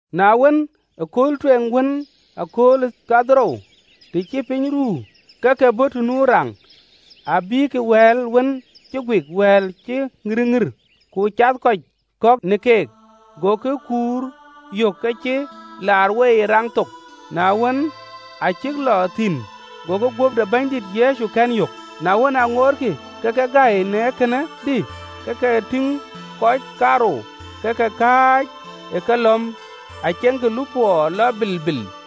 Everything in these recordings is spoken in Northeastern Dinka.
Na wën, ëkööl tueŋ wën ë akööl dhorou, të cï piny ruu, ke ke bɔ̈ të nu raŋ, bïïkï wɛ̈ɛ̈l wën cïk guik wɛ̈ɛ̈l cï ŋïrëŋïr, ku cath kɔc kɔ̈k në keek. Gokï kuur yök aacï laar wei ë raŋ thok. Na wën, aa cïk lɔ thïn, gokï guöp de Bɛ̈nydït Yecu kɛ̈n yök. Na wën, aa ŋootkï ke ke gäi në kënë, dï, ke ke tïŋ kɔc kaarou ke ke kääc ë kelɔ̈m, aceŋkï lupɔɔ lɔ bilbil.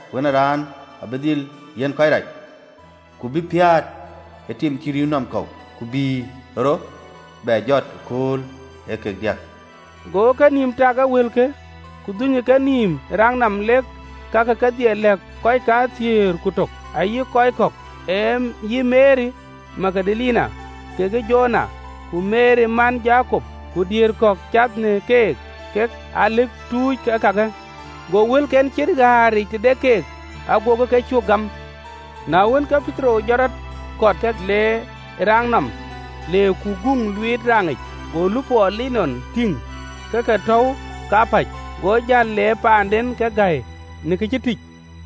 ‘Wën ë Raan abï dhil yiɛ̈n kɔc rac, ku bï piäät ë tim cï rïïu nɔm kɔ̈u, ku bï rɔt bɛ jɔt ëkööl ee kek diäk.”’ Gokï kenïïm tak ë wëlke, ku dhunykï kenïïm ë raŋ nɔm, lek kakë kedhie lɛ̈k kɔc kathiëër ku tök, ayï kɔc kɔ̈k. Ee yï Meri Magdalene, kekë Jowana, ku Meri man Jakop, ku diëër kɔ̈k cath në keek, kek aa lëk tuuc ee kakë. Go wëlken ciët ɣäär yiic tëde keek, agokï ke cuö gam. Na wën, ke Petero jɔt rɔt, kɔt ke lɔ ë raŋ nɔm: le ku guŋ luiit raŋic, go lupɔɔ linɔn tïŋ ke ke tɔ̈u kapäc, go jäl le paanden ke gäi në kë cï tïc.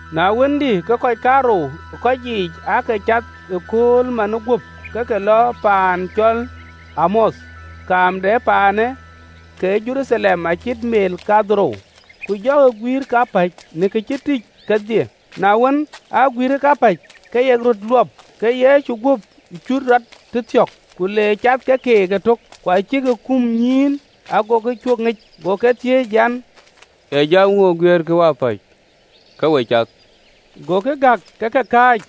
Na wën, dï, ke kɔc kaarou ë keyiic aake cath ëkööl manë guöp ke ke lɔ paan cɔl Emauth, kaam de paanë ke Jeruthalem acït meel kadhorou. Ku jɔkï guïïr kapäc në kë cï tïcë kedhie. Na wën, aa jamkï kapäc, ku yek röt luɔp, ke Yecu guöp cut rɔt tëthiɔ̈k, ku le cath ke keek ëtök. Ku acï ke kum nyïïn, agokï cuö ŋic. Go ke thiëëc an, “Ee jam ŋö guiɛɛrkï wapäc, ke we cath?” Gokï gäk ke ke kääc,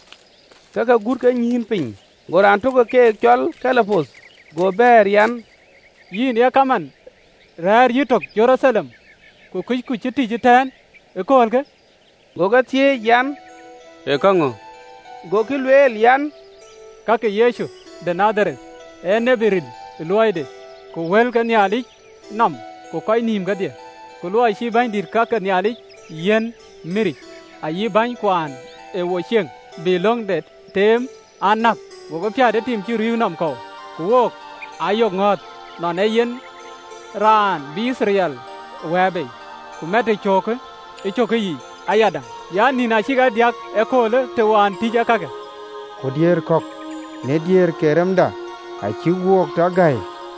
ke ke gut kenyïïn piny. Go raan tök ë keek, cɔl Kleopath, go bɛ̈ɛ̈r an, “Yïn ye kaman rɛ̈ɛ̈r yïtök ë Jeruthalem, ku kuc kë cï tïc ëtɛ̈ɛ̈n ë aköölkë?” Go ke thiëëc an, “Ee käŋö?” Gokï lueel an, “Ka ke Yecu de Nadhareth, ee tiët ril ë luɔide ku wëlke ë Nhialic nɔm ku në kɔc nïïm kedhie. Ku luɔi cï bänydït ke ka ke Nhialic e yiɛ̈n miric, ayï bänykuɔn ë wo cieŋ, bï löŋde teem an, näk, gokï piäät ë tim cï rïïu nɔm kɔ̈u. Ku wook, aa yok ŋɔ̈ɔ̈th, nɔn ee yen raan bï Yithriɛl wɛ̈ɛ̈r bei. Ku matë cöökë ë cökkë yiic ayadäŋ an, nïn acïk aa diäk ee köölë të wään tïc ee kakë. Ku diëër kɔ̈k në diëër ke remda acïk wo tɔ gäi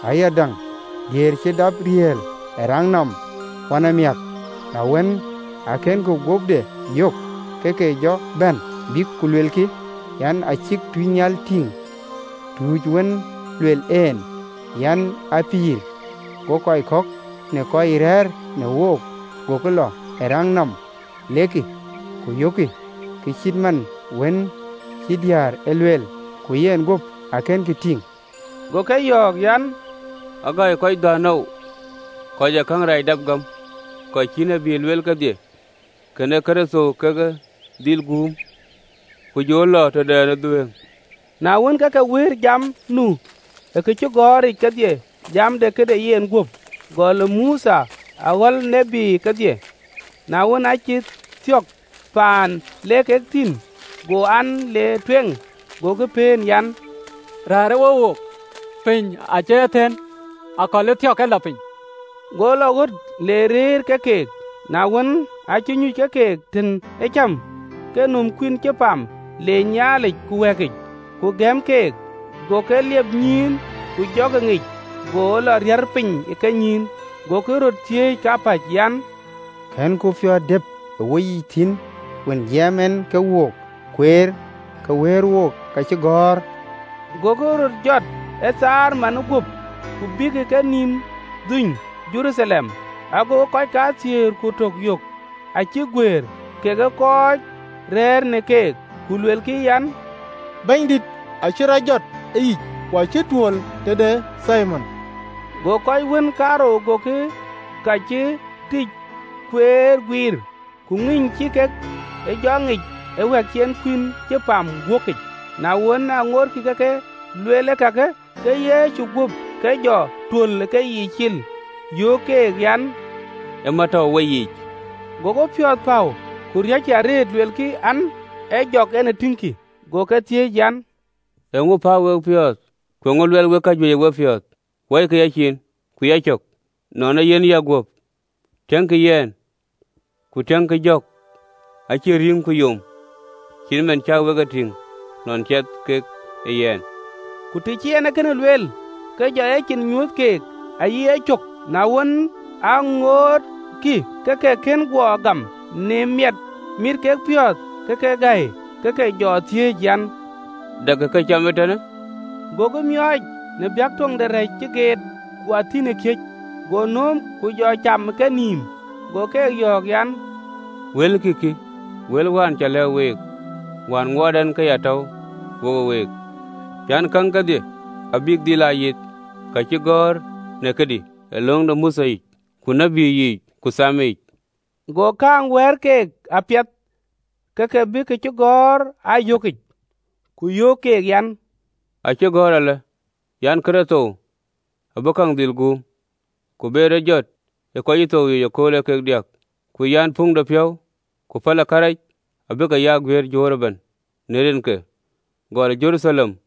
ayadäŋ, diëër cï dap riɛɛl ë raŋ nɔm wënamiäk, na wën, akënkï guöpde yök, ke ke jɔ bɛ̈n, bïk ku luelkï an, cïk tuucnhial tïŋ ë nyuuthic, tuuc wën lueel en an, a pïïr. Go kɔc kɔ̈k në kɔc rɛ̈ɛ̈r në wook gokï lɔ ë raŋ nɔm, lek ku yökkï ke cït man cï diäär e lueel: ku yenguöp akënkï tïŋ.” Go ke yɔ̈ɔ̈k an, “Agäi kɔc dhän oou, kɔc ë käŋ rɛɛc dap gam ka cï tït lueel kedhie! Kën Kërtho kake dhil guum, ku jɔ lɔ tëde ë dhuëëŋ? Na wën, ke ke wëër jam nu ë kacïgɔ̈ɔ̈r yiic kedhie, jam de yenguöp, gɔl ë Mothe aɣɔ̈l tït kedhie. Na wën, aa cïk thiɔ̈k ë paan le kek thïn, go an, le tueŋ. Gokï pëën an, “Rɛ̈ɛ̈rë we wook, piny acï aa thëën, akɔ̈l ë thiɔ̈k ke lɔ piny.” Go lɔ ɣöt le rëër ke keek. Na wën, aacï nyuc ke keek tën ee cam, ke nöm kuïn cï pam, leec Nhialic, ku wɛ̈ɛ̈kic, ku gëm keek. Go ke liep nyïïn, ku jɔkï ŋic, go lɔ riär piny ë kenyïïn. Gokï röt thiëëc kapäc an, “Kënku piɔ̈ɔ̈th dëp ë woyiic thïn, wën jiɛɛm en ke wook kueer, ke wëër wo kacïgɔ̈ɔ̈r?” Gokï röt jɔt ë thaar manë guöp, ku bekï kenïïm dhuöny Jeruthalem, agokï kɔc kathiëër ku tök yök acïk guëër, kekë kɔc ë rëër në keek, ku luelkï an, “Bɛ̈nydït acï rɔt jɔt ë yic! Ku acï tuöl tëde Thimon!” Go kɔc wën kaarou gokï ka cï tïc kueer guiir, ku ŋïny cï kek e jɔ ŋic ë wɛ̈ɛ̈k cï en kuïn cï pam wääkic. Na wën, aa ŋootkï ke ke luel kakë, ke Yecu guöp ke jɔ tuöl ë keyiic cil, yöök keek an, “Ë mät tɔ̈u ë weyiic.” Gokï piɔ̈ɔ̈th päu ku riɔ̈ckï arëët, luelkï an, ee jɔk en ë tïŋkï. Go ke thiëëc an, “Eeŋö päu wek piɔ̈ɔ̈th? Ku eeŋö luɛɛl wek kajuëc ë wepiɔ̈ɔ̈th? Wɔikï yacin ku yacök, nɔn ee yen yɛn guöp? Tiɛckï yɛn ku tiëŋkï, jɔk acïn rïŋ ku yom, cït man cä wek e tïŋ nɔn ciɛth kek ë yɛn.” Ku të cï en kënë lueel, ke jɔ ecin nyuöth keek ayï yecök. Na wën, aa ŋootkï ke ke kën guɔ gam në miɛt mit kek piɔ̈ɔ̈th, ke ke gäi ke ke jɔ thiëëc an, “Dɛkï këcam ee tënë?” Gokï miɔɔc në baŋ töŋ de rɛ̈c cï geet, ku athïn ë kiëc. Go nööm, ku jɔ cam ë kenïïm. Go keek yɔ̈ɔ̈k an, “Wëlkï kï, wël wään cä lɛ̈k week, wään ŋuɔɔt ɛn ke ya tɔ̈u wo week an, “Käŋ kedhie abïk dhil aa yith, ka cï gɔ̈ɔ̈r në këdï ë löŋ de Mothe yic, ku tït yiic, ku Diɛt yiic.” Go käŋ wɛ̈ɛ̈r keek apiɛth, ke ke bï kacïgɔ̈ɔ̈r aa yök yiic, ku yöök keek an, acï gɔ̈ɔ̈r alë an: “Kërtho abï käŋ dhil guum, ku be rɔt jɔt ë kɔc cï thou yiic ëkööl ee kek diäk, ku an, puŋdepiɔ̈u ku päl ë kërac abï ke ya guiëër juöör ëbɛ̈n në rinke, gɔl ë Jeruthalem.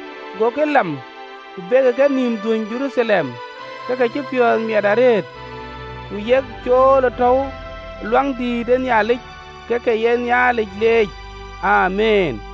Gokï lam ku bekï kenïïm dhuöny Jeruthalem ke ke cï piɔ̈ɔ̈th miɛt arëët: ku yek cool ë tɔ̈u Luaŋdïtic, ke ke ye Nhialic leec. Amiin.